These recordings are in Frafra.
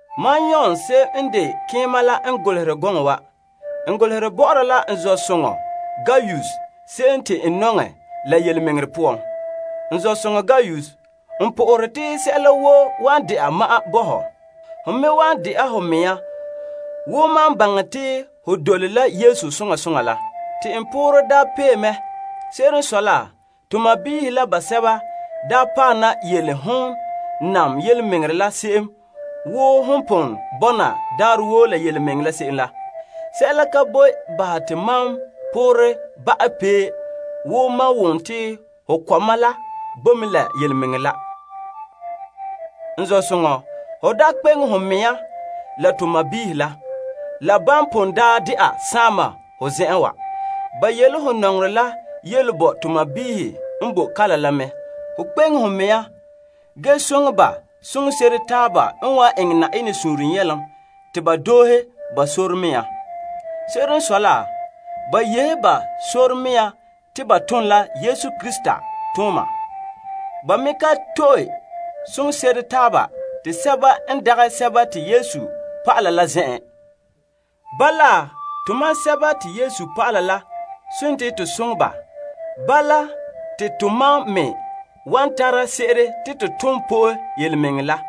Mam Yon se'em n de keema la n golehere gɔŋɔ wa bɔ'ɔra la n zɔ'soŋɔ Gaius se'em te n nɔŋɛ la yelemɛŋɛrɛ poan. N zɔ'soŋɔ Gaius, n po'ohere te sɛla woo wan de'a ma'an bo ho. Ge te ho me wan de'a ho mea wo mam baŋɛ te ho dole la Yesu soŋa soŋa la. Te n poore daa pee mɛ. Se'ere n sɔe la, to sɔɔnrɔ la basɛba daa paɛ na yele hon birikina la se'em wo hon pon bɔna daarɛ woo la birikina la se'em la. Sɛla ka boe bahɛ te mam poorɛ ba'a pee wo mam wom te n kɔma la bo mɛ la yelemɛŋɛrɛ la. N zɔ'soŋɔ, ho dela birikina la hon tone se'em bɔ'ɔra to sɔɔnrɔ la, la ban pon daa de'a saama ho zen'en wa. Ba yele ho nɔŋerɛ la yele bo lagaŋɔ la n boe kalam la. Kpeŋe ho mɛŋa ge soŋɛ ba soŋse'ere taaba n wan eŋɛ Yenɛ suunre nyɛlom te ba doohe ba sɔrɔɔ mea. Se'ere n sɔe la, ba yehe ba sɔrɔɔ mea te ba tom la Yesu Krista yu'urɛ la zuo. Ba me ka to'e soŋse'ere sɛba n dagɛ Yesu dɔlɔba la zen'en. Bala tomam sɛba te Yesu pa'ala la n de to soŋɛ ba, te tomam me wan tara se'ere te to tom po'e yelemɛŋɛrɛ la.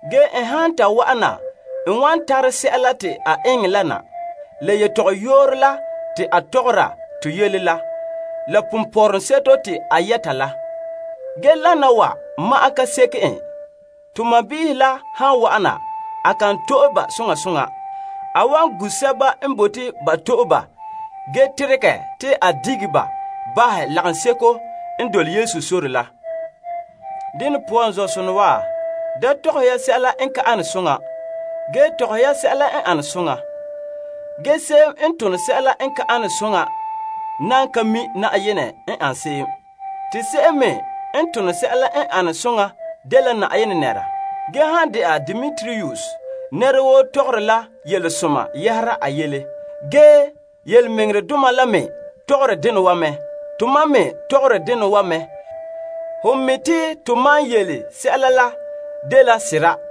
Bala n han ta wa'ana n wan tara sɛla te a eŋɛ la na. La tɔgɔyooro la te a tɔgɔra to yele la, la ponpɔrɔŋseto te a yɛta la. Ge lana wa ma'an ka seke en. To sɔɔnrɔ la han wa'ana, a kan to'e ba soŋa soŋa, ge a gu' sɛba n bote ba to'e ba ge teregɛ te ba sa'ɛ ba lagaŋɔ la poan. Dene poan, n zɔ'sonɔ wa, da eŋɛ ya sɛla n ka ane soŋa, ge eŋɛ ya sɛla n ane soŋa. Ge se'em n tone sɛla n ka tone soŋa nan ka mi' Na'ayenɛ n ane se'em. Te se'em me n tone sɛla n ane soŋa dela Na'ayenɛ nɛra. Ge han dɛna Demetrius, nɛra woo tɔgɔre la yelesoma yɛhera a yele. Yelemɛŋɛrɛdoma la me tɔgɔre dena wa mɛ. Tomam me tɔgɔre dena wa me, ge ho mi' te tomam yele sɛla la dela sera.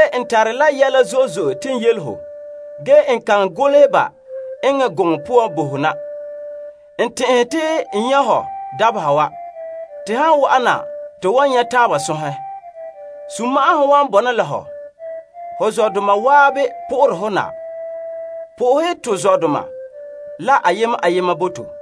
N tare yɛla zo'e zo'e te n yele ho, ge n kan bote te n golehɛ ba eŋɛ gɔŋɔ poan bo ho na. N tɛn'ɛhe te n nyɛ' ho dabeha wa. Te han wa'ana, to wan nyɛ' taaba sɔnhɛ. Sunma'ahom wan bɔna la hɔ. Ho zɔdoma waabe po'ohere hɔ na. Po'ohɛ to zɔdoma la ayema ayema bo to.